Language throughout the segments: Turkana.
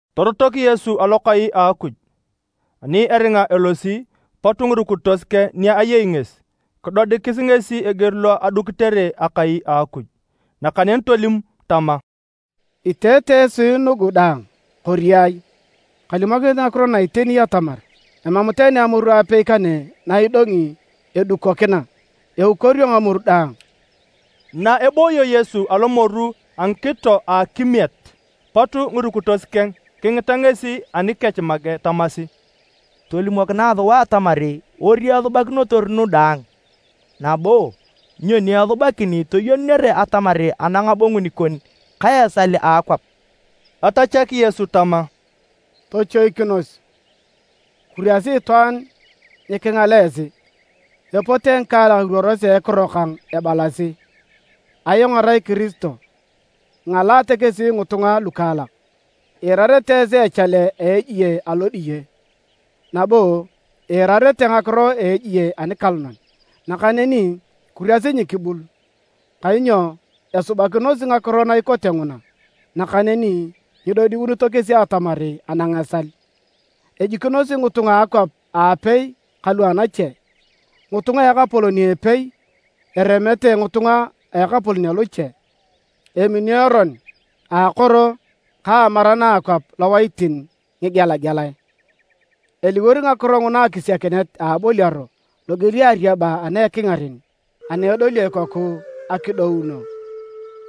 Torotok Yesu alokai a Akuj, ani eringa elosi, pot ngirukitos keng ni ayei ngesi kidodikis ngesi eger lo edukitere akai a Akuj. Nakaneni tolim tama, “Iteete esi nugu daang, kori ai? Kalimokinit ngakiro na iteni atamar, emam tani amoru apei kane na idongi edukokina, eukorio ngamoru daang.” Na ebooyo Yesu alomoru a ngikito a akimiet, pot ngirukitos keng kingita ngesi anikech make tamasi, “Tolimokinae sua atamar ori esubakinotor nu daang, nabo nyoni esubakin toyenunere atamar anang abongun kon ka esal a akwap.” Tatachak Yesu tama, “Tochoikinos! Kuriasi itwaan nyikingal esi! Epote ngikaalak iruorosi a ekiro kang ebalasi, ‘Ayong arai Kiristo.’ Ingalaate kesi ngitunga lukaalak. Iirarete esi echale a ejie alodiye, nabo iirarete ngakiro a ejie anikalonan. Nakaneni kuriasi nyikibul, kainyo esubakinosi ngakiro na ikote nguna, nakaneni nyidodiunito kesi atamar anang esal. Ejikinosi ngitunga a akwap aapei kalu anache, ngitunga a ekapolon a epei eremete ngitunga a ekapolon aloche. Emini eron a akoro ka amaran a akwap lowaitin ngigelagelae. Eliwor ngakiro nguna akisiakinet a aboliaro loger a ariaba ana ekingaren ana edolio ikoku akidouno.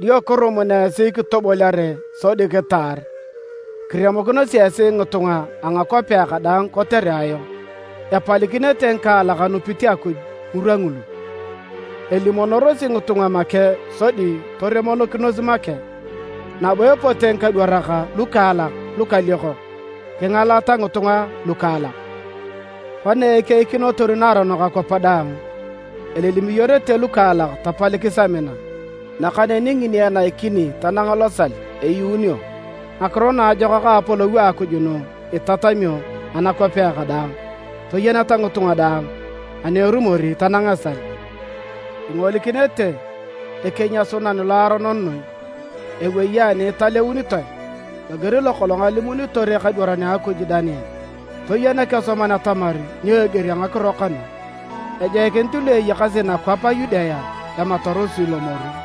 “Dio kirumun esi kitoboliare sodi kitaar. Kiremokinosi esi ngitunga a ngakwapea kadaang kotere ayong. Epalikinete ngikaalak anupit Akuj ngirwa ngulu. Elimonorosi ngitunga make sodi toremonokinos make. Nabo epote ngikadwarak lukaalak lukaliokok kingalata ngitunga lukaalak. Kona ekeikinotor naaronok akwap daang, elilimiyorete lukaalak tapalikis amina. Nakaneni ngini enaikini tanang losal, eyuunio. Ngakiro Naajokak a Apolou a Akuj nu itatamio anakwapea kadaang toyeneta ngitunga daang, ani erumor tanang esal. “Ingolikinete ‘Ekenyasunan Loaronon noi’ ewei ani italeunitoe, loger lokolong alimunitor ekadwaran a Akuj Daniel. (Toyen ekesoman atamar nyo eger a ngakiro kanu!) Ejoikinit lu eyakasi nakwap a Yudea ematarosi lomoru.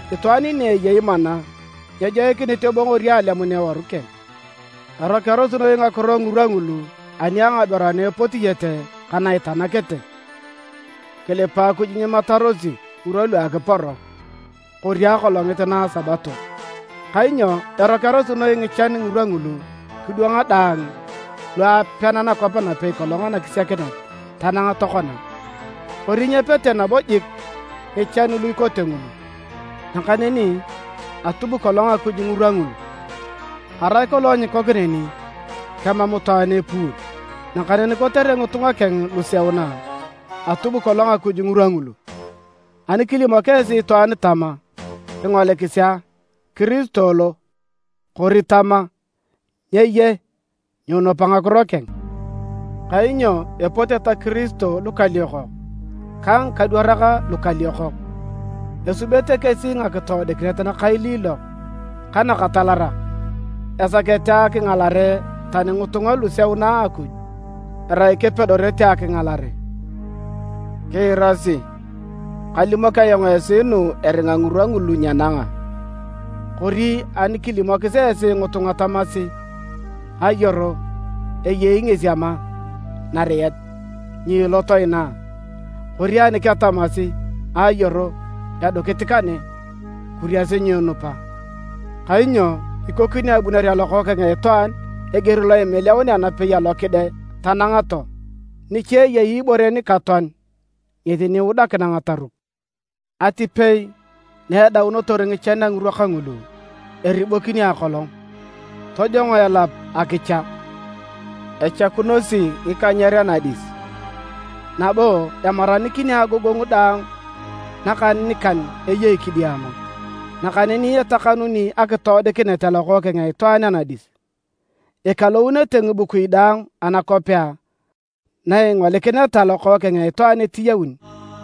Itwaan ni eyei mana nyejoikinit ebongori alemun eworu keng. Erokearosi noi ngakiro ngirwa ngulu ani a ngaberu ana epotiete ka na itanakete. Kilipa Akuj nyimatarosi ngirwa lu akiporo kori akolongit na a Sabato. Kainyo erokearosi noi ngichan ngirwa ngulu kidwanga daang lu apean nakwap napei kolong anakisiakinet tanang tokona. Kori nyepete nabo jik ngichan lu ikote ngulu. Nakaneni atub kolong Akuj ngirwa ngulu. Arai kolong nyiikok neni, kemam itwaan epuun. Nakaneni kotere ngitunga keng luseuna, atub kolong Akuj ngirwa ngulu. “Ani kilimok esi itwaan tama, ‘Kingolikisi a! Kiristo lo!’ kori tama: ‘Nye ye’, nyiinupa ngakiro keng. Kainyo epote ta Kiristo lukaliokok ka ngikadwarak lukaliokok. Esubete kesi ngakitoodikinet nakailiilok ka nakatalarak esakete akingalare tani ngitunga luseuna a Akuj, erai kepedorete akingalare. Kiirasi! Kalimok ayong esi nu eringa ngirwa ngulu nyenanga. “Kori ani kilimokis esi ngitunga tamasi: ‘Ayoro, eyei ngesi ama nariet’, nyiilot inaa, kori ani ketamasi: ‘Ayoro, edukit kane.’ Kuriasi nyiinupa! Kainyo ikoni abunere a Lokookeng a Itwaan eger lo imiliaunea napei alo kide tanang too. “Nicha eyei ibore nikatoan, ngesi ni iudakina ngataruk. “Atipei na edaunotor ngichan a ngirwa kangulu, eribokini akolong, tojongo elap akicha. Echakunosi ngikanyer anadis, nabo emaranikini agogongu daang nakaninikan eyei kidiama. Nakaneni etakanuni akitoodikinet a Lokookeng a Itwaan anadis. Ikalounete ngibukui daang anakwapea na ingolikineta Lokookeng a Itwaan etiyaun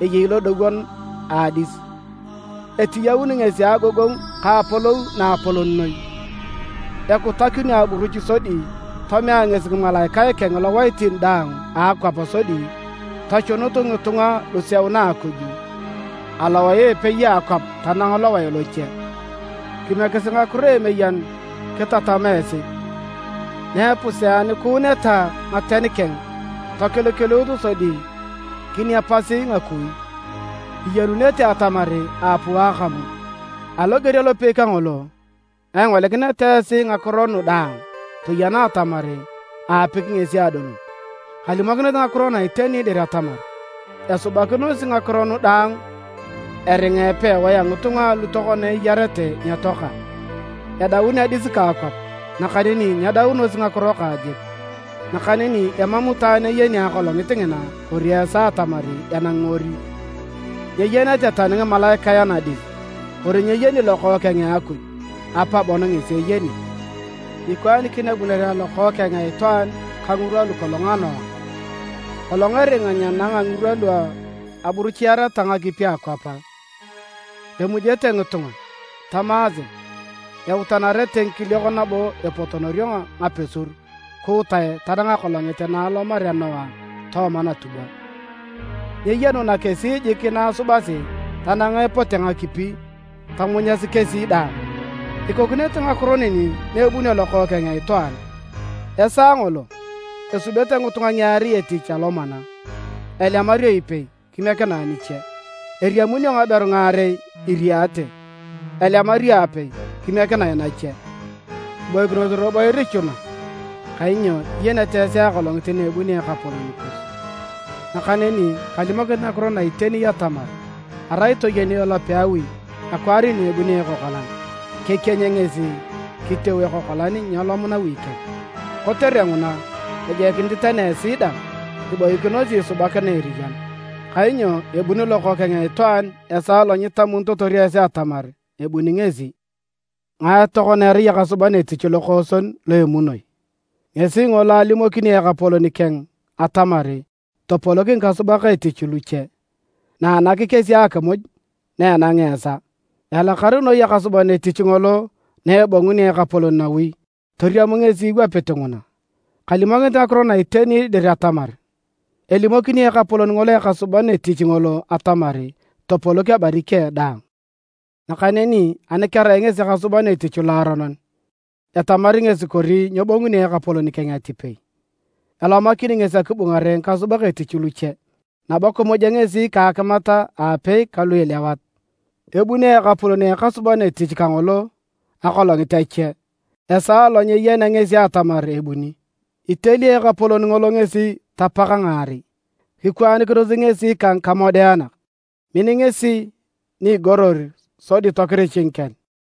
eyei lodowon a adis, etiyaun ngesi a agogongu ka apolou naapolon noi. Ekutakinio aburuch sodi tomea ngesi ngimalaikae keng lowaitin daang a akwap sodi tochunut ngitunga luseuna a Akuj alowae a epei a akwap tanang lowae loche. “Kimiekisi ngakiro a emeyen kitatama esi. Na epuseakuuneta ngaten keng tokilikiluut sodi kiniapasi ngakui, iyenunete atamar aapuu akamu. Aloger alopei kangolo, na ingolikineta esi ngakiro nu daang toyena atamar aapiki ngesi adolun. Kalimokinit ngakiro na iteni dir atamar esubakinosi ngakiro nu daang eringa epewae a ngitunga alu tokona eyarete nyetoaka. Edaun adis ka akwap, nakaneni nyedaunosi ngakiro kang jik. “Nakaneni emam itwaan eyeni akolongit ngina kori esaa atamar enangi ori, nyeyenete tani ngimalaikae anadis kori nyeyeni Lokookeng a Akuj. Apa bon ngesi eyeni. Ikwaanikin abunere a Lokookeng a Itwaan ka ngirwa lu kolong a Noa. Kolong eringa nyenanga ngirwa lu aburuchiareta ngakipi akwap, emujete ngitunga, tamaase. Eutanarete ngikiliok nabo epotonorio ngapesur kuutae tanang akolongit na alomarea Noa tooma natubwa. Nyeyenuna kesi jik na asubasi tanang epote ngakipi tomunyasi kesi daang. Ikokinete ngakiro neni na ebunio Lokookeng a Itwaan. Esaa ngolo, esubete ngitunga ngiarei etich alomana. Elemario ipei kimiekinae niche. Eriamunio ngaberu ngaarei iriete, elemario apei, kimiekinae nache. “Kiboikinos robo irichuna kainyo nyiyenete esi akolongit na ebunio Ekapolon kus. Nakaneni kalimokinit ngakiro na iteni atamar arai toyeni elope a awi akwaar na ebunio ekokolan, kekieny ngesi kiteu ekokolan nyeelom nawi keng. Kotere nguna, ejoikinit tani esi dang iboikinosi isubakina eriyan, kainyo ebuni Lokookeng a Itwaan esaa lo nyitamitotor esi atamar ebuni ngesi. “Ngae tokona erai ekasuban etich lokooson lo emunoi? Ngesi ngolo alimoki ekapolon keng atamar topolok ngikasubak etich luche, nanak kesi akimuj na enangea esaa. Elakar noi ekasuban etich ngolo na ebongunio ekapolon nawi toriam ngesi iwapit nguna! Kalimokinit ngakiro na iteni dir atamar, elimokini ekapolon ngolo ekasuban etich ngolo atamar topolok ebari keng daang. Nakaneni ani kerai ngesi ekasuban etich loaronon, etamari ngesi kori nyebonguni ekapolon keng atipei. Elomakini ngesi akibungare ngikasubak etich luche, nabo kimuja ngesi ka akimat aapei kalu ilewat. Ebonguni ekapolon a ekasuban etich kangolo akolongit ache a esaa alo nyeyenea ngesi atamar ebuni. Iteli ekapolon ngolo ngesi tapak ngaarei, kikwaanikinos ngesi ka ngikamodeanak. Min ngesi ni igoror sodi tokirich ngikel.